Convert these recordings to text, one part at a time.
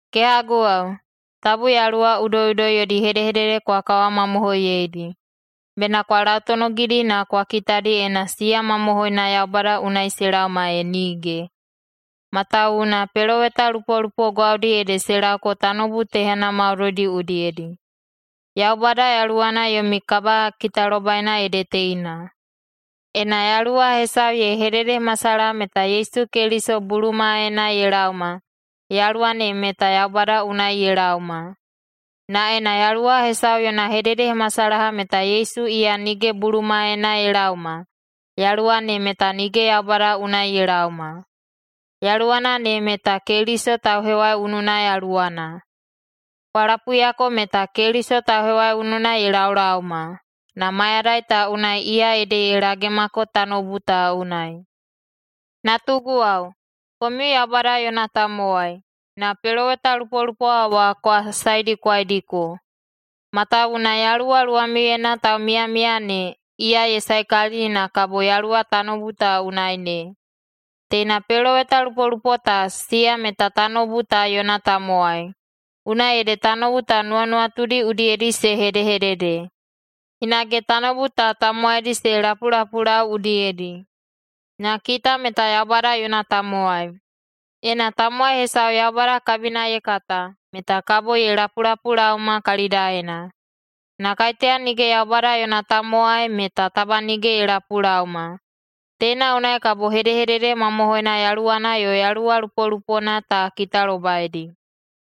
Kehaguwao, tabu yaluwa udoiꞌudoi yodi hedehedede kwa kawamamohoiyeidi. Bena kwa lautonogidi na kwa kitadi ena siya mamohoina Yaubada unai se laoma, e nige. Matawuwuna pelowetalupolupo gwaudi ede se laoko tanoubu tehana maudoidi udiyedi. Yaubada Yaluwana yomi kabakitalobaina ede teina: Ena yaluwa hesau ye hededehemasalaha meta Yesu Keliso bulumaena ye laoma, yaluwa ne meta Yaubada unai ye laoma. Na ena yaluwa hesau yona hededehemasalaha meta Yesu iya nige bulumaena ye laoma, yaluwa ne meta nige Yaubada unai ye laoma. Yaluwana ne meta Keliso tauhewaiununa yaluwana. Kwa lapuiyako meta Keliso tauhewaiununa ye laolaoma, na mayadai ta unai iya ede ye lagemako tanoubu ta unai. Natuguwao, komiu Yaubada yona tamowai, na pelowetalupolupo wa kwa saedikwaidiko, matawuwuna Yaluwa luwamiuyena taumiyamiya ne, iya ye saekalili na kabo yaluwa tanoubu ta unai ne. Teina pelowetalupolupo ta, siya meta tanoubu ta yona tamowai, unai ede tanoubu ta nuwanuwatudi udiyedi se hedehedede, hinage tanoubu ta tamowaidi se lapulapulau udiyedi. Na kita meta Yaubada yona tamowai. Ena tamowai hesau Yaubada kabina ye kata, meta kabo ye lapulapulaoma kalidaena. Na kaiteya nige Yaubada yona tamowai, meta taba nige ye lapulaoma. Teina unai kabo hedehedede mamohoina yaluwana yo yaluwa lupolupona ta kitalobaidi.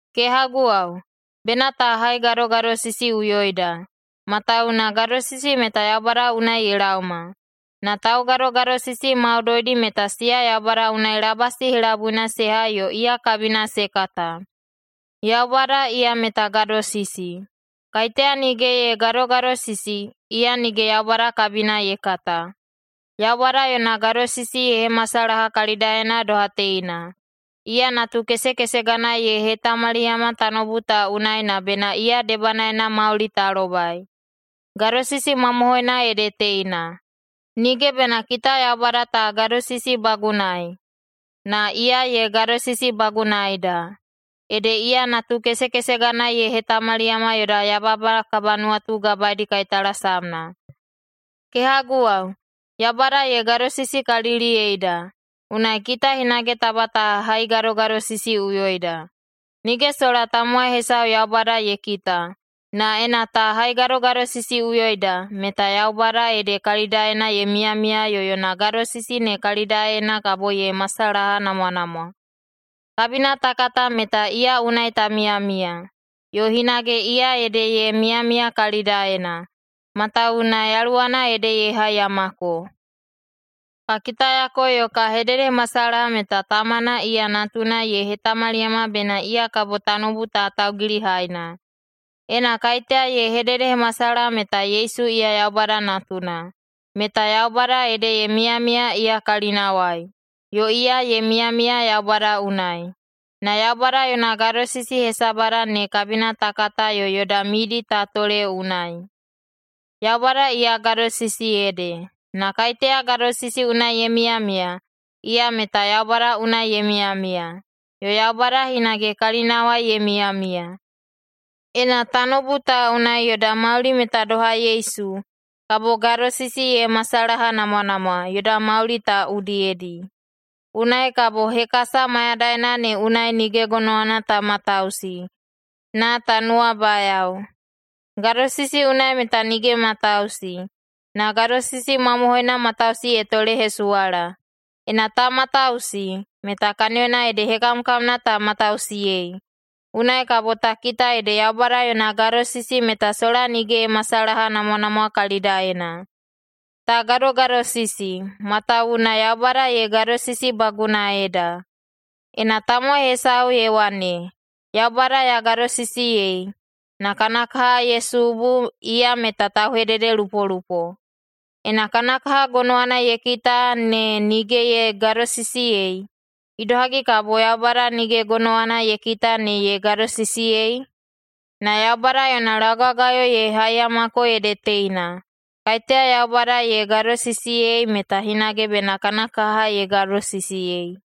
Kehaguwao, bena ta haigadogadosisiꞌuyoida, matawuwuna gadosisi meta Yaubada unai ye laoma, na taugadogadosisi maudoidi meta siya Yaubada unai labasi helabuina se hai yo iya kabina se kata. Yaubada iya meta gadosisi. Kaiteya nige ye gadogadosisi, iya nige Yaubada kabina ye kata. Yaubada yona gadosisi ye hemasalaha kalidaena doha teina: Iya Natukesekesegana ye hetamaliyama tanoubu ta unai na bena iya debanaena mauli ta lobai. Gadosisi mamohoina ede teina: Nige bena kita Yaubada ta gadosisibagunaei, na iya ye gadosisibagunaeida, ede iya Natukesekesegana ye hetamaliyama yoda yababa kabanuwatugabaeidi kaitalasamna. Kehaguwao, Yaubada ye gadosisikaliliyeida, unai kita hinage taba ta haigadogadosisiꞌuyoida. Nige sola tamowai hesau Yaubada ye kita, na ena ta haigadogadosisiꞌuyoida, meta Yaubada ede kalidaena ye miyamiya yo yona gadosisi ne kalidaena kabo ye masalahanamwanamwa. Kabina ta kata meta iya unai ta miyamiya, yo hinage iya ede ye miyamiya kalidaena, matawuwuna Yaluwana ede ye haiyamako. Ka kitayako yo ka hededehemasalaha meta Tamana iya Natuna ye hetamaliyama bena iya kabo tanoubu ta Taugilihaina. Ena kaiteya ye hededehemasalaha meta Yesu iya Yaubada Natuna, meta Yaubada ede ye miyamiya iya kalinawai, yo iya ye miyamiya Yaubada unai. Na Yaubada yona gadosisi hesabada ne kabina ta kata yo yoda midi ta tole unai. Yaubada iya gadosisi ede, na kaiteya gadosisi unai ye miyamiya, iya meta Yaubada unai ye miyamiya, yo Yaubada hinage kalinawai ye miyamiya. Ena tanoubu ta unai yoda mauli meta doha Yesu, kabo gadosisi ye masalahanamwanamwa yoda mauli ta udiyedi. Unai kabo hekasa mayadaina ne unai nige gonowana ta matausi, na ta nuwabayao. Gadosisi unai meta nige matausi, na gadosisi mamohoina matausi ye tolehesuwala. Ena ta matausi, meta kaniyona ede hekamkamna ta matausiyei. Unai kabo ta kita ede Yaubada yona gadosisi meta sola nige ye masalahanamwanamwa kalidaena. Ta gadogadosisi, matawuwuna Yaubada ye gadosisibagunaeida. Ena tamowai hesau ye wane, “Yaubada ya gadosisiyei!”, na kana kaha ye subu, iya meta tauhededelupolupo. Ena kana kaha gonowana ye kita ne nige ye gadosisiyei, idohagi kabo Yaubada nige gonowana ye kita ne ye gadosisiyei? Na Yaubada yona laugagayo ye haiyamako ede teina: Kaiteya Yaubada ye gadosisiyei, meta hinage bena kana kaha ye gadosisiyei.